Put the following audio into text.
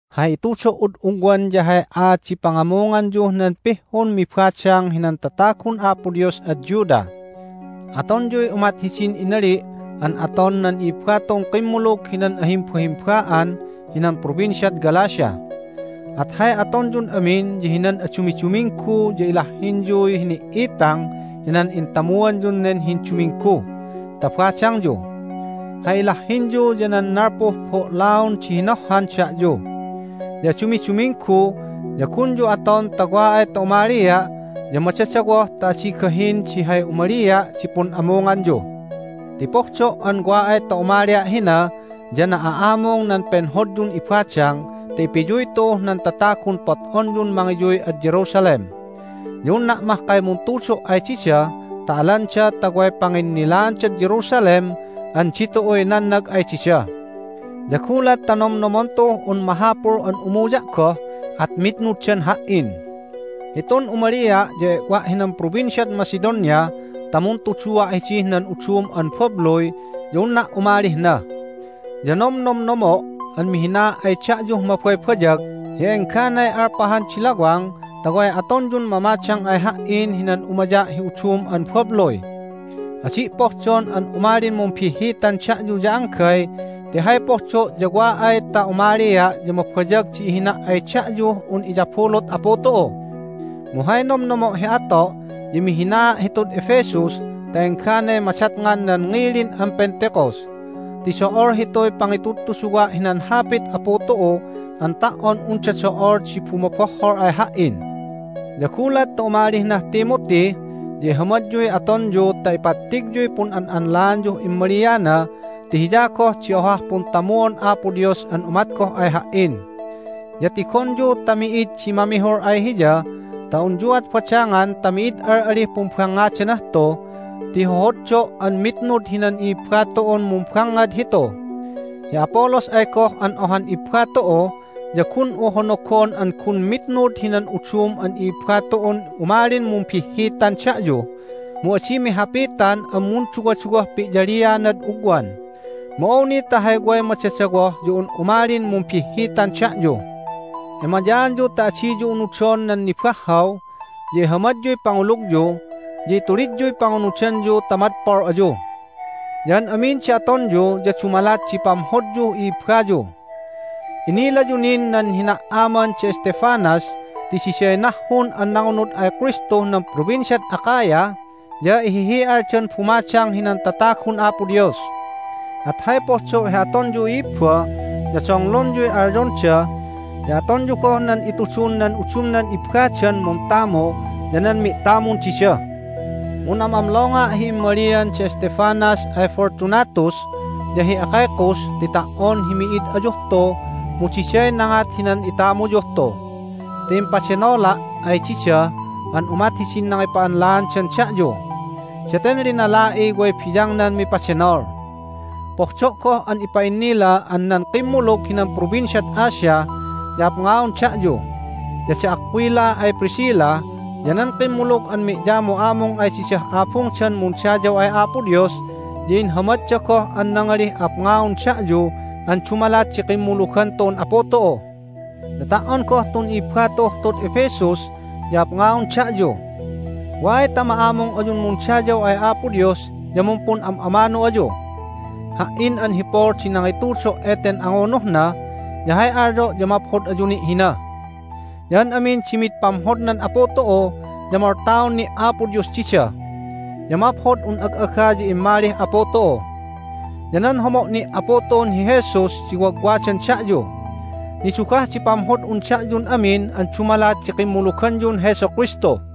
Hay itudo"ud ugwan ya hay aat di pangamunganyuh nan pihhun mibadang hinan tatagun Apo Dios ad Judah. Atonyuy umat hidin inali' an aton nan i'ibba tu'un kimmulug hinan ahimbahimba'an hinan Provinciad Galatia. At hay atonyun amin ya hinan aDumiduminggu ya ilahhinyuy hini"itang hinan intamuanyun nen hinduminggu ta badangyu. Hay ilahhinyu ya nan nalpuh bo'laon di hinohhan da'yu. Ya aDumiduminggu ya gunyu aton ta wa ay ta umalia' ya madadawoh ta adi gahin di hay umalia' di pun'amunganyu. Ti pohdo' an wa ay ta umalia' hina ya na'a'amung nan penhodyun ibadang ta ipiyuy tu'uh nan tatagun pot'onyun mangiyuy ad Jerusalem. Ya unna' mahkay muntudo' ay dida ta alanda ta way panginnilaandad Jerusalem an ditu'uy nannag ay dida. Ya gulat ta nomnomon tu'uh un mahapul an umuya' goh at mitnuddan ha"in. Hitun umalia' ya e'wa' hinan Provinciad Macedonia ta muntudua' hidih nan udum an babluy ya unna' umalih na. Ya nomnomnomo' an mihinaa' ay da'yuh mabaybayag hi engganay alpahan di lawang ta way atonyun mamadang ay ha"in hinan umaya' hi udum an babluy. Adi' pohdon an umalin mumbihhitan da'yu ya anggay ti hay pohdo' ya wa ay ta umalia' ya mabayag di ihina' ay da'yuh un iyabulut Apu tu'u. Mu hay nomnomo' hi ato' ya mihinaa' hitud Ephesus ta engganay madatngan nan ngilin an Pentecost ti do'ol hituy pangitudtuduwa' hinan Hapit Apu tu'u an ta"on unda do'ol di bumobohhol ay ha"in. Ya gulat ta umalih nah Timothy ya ihamadyuy atonyu ta ipattigyuy pun'an'anlaanyuh immaliana ti hiya goh di ohah puntamuon Apo Dios an umat goh ay ha"in. Ya tigonyu ta mi'id di mamihul ay hiya ta unyuat badangan ta mi'id al'alih pumbangngadanah tu ti hohoddo' an mitnud hinan i'ibba tu'un mumbangngad hitu. Hi Apollos ay goh an ohan ibba tu'u ya gun'u honogon an gun mitnud hinan udum an i'ibba tu'un umalin mumbihhitan da'yu, mu adi mihapitan an munduwaduwah pi'yalianad ugwan. Mu awni ta hay way madadawoh ya un umalin mumbihhitan da'yu. Emayaanyu ta adiyu unudon nan nibahhaw, ya ihamadyuy pangulugyu, ya itulidyuy pangunudanyu ta madpol ayu. Ya an amin di atonyu ya dumalat di pamhodyuh i'ibbayu. Inilayu nin nan hina"aman da Stephanas ti diday nahhun an nangunud ay Kristuh nan Provinciad Achaia, ya ihihi'aldan bumadang hinan tatagun Apo Dios. At hay pohdo' hi atonyu, i'ibba, ya donglonyuy alyonda, ya atonyu goh nan itudun nan udumnan ibbadan muntamu ya nan mi'tamun dida. Mun'am'amlonga' hi immalian da Stephanas ay Fortunatus, ya hi Achaicus ti ta"on hi mi'id ayuh tu mu diday nangat hinan itamuyuh tu. Ti impadenola' ay dida an umat hidin nangipa'anlaandan da'yu. Daten linala'iy way biyangnan mipadenol. Pohdo' goh an ipa'innila an nan kimmulug hinan Provinciad Asia ya apngaon da'yu. Ya da Aquila ay Priscilla ya nan kimmulug an mi'yamu'amung ay didah abungdan mundayaw ay Apo Dios ya inhamadda goh an nangalih apngaon da'yu an dumalat di kimmulugan tu'un Apu tu'u. Ya ta"on goh tun i'ibba tu'uh tud Ephesus ya apngaon da'yu. Wa ay ta ma'amung ayun mundayaw ay Apo Dios ya mumpun'am'amanu ayu. Ha"in an hi Paul di nangitudo' eten angunuhna, ya hay alyo' ya maphod ayu ni' hina. Ya an amin di mid pamhodnan Apu tu'u ya moltaon ni' Apo Dios dida! Ya maphod un ag'aga ya immalih Apu tu'u! Ya nan homo' ni' Apu tu'un hi Jesus di wagwadan da'yu. Nidugah di pamhod'un da'yun amin an dumalat di kimmuluganyun Jesu Kristu.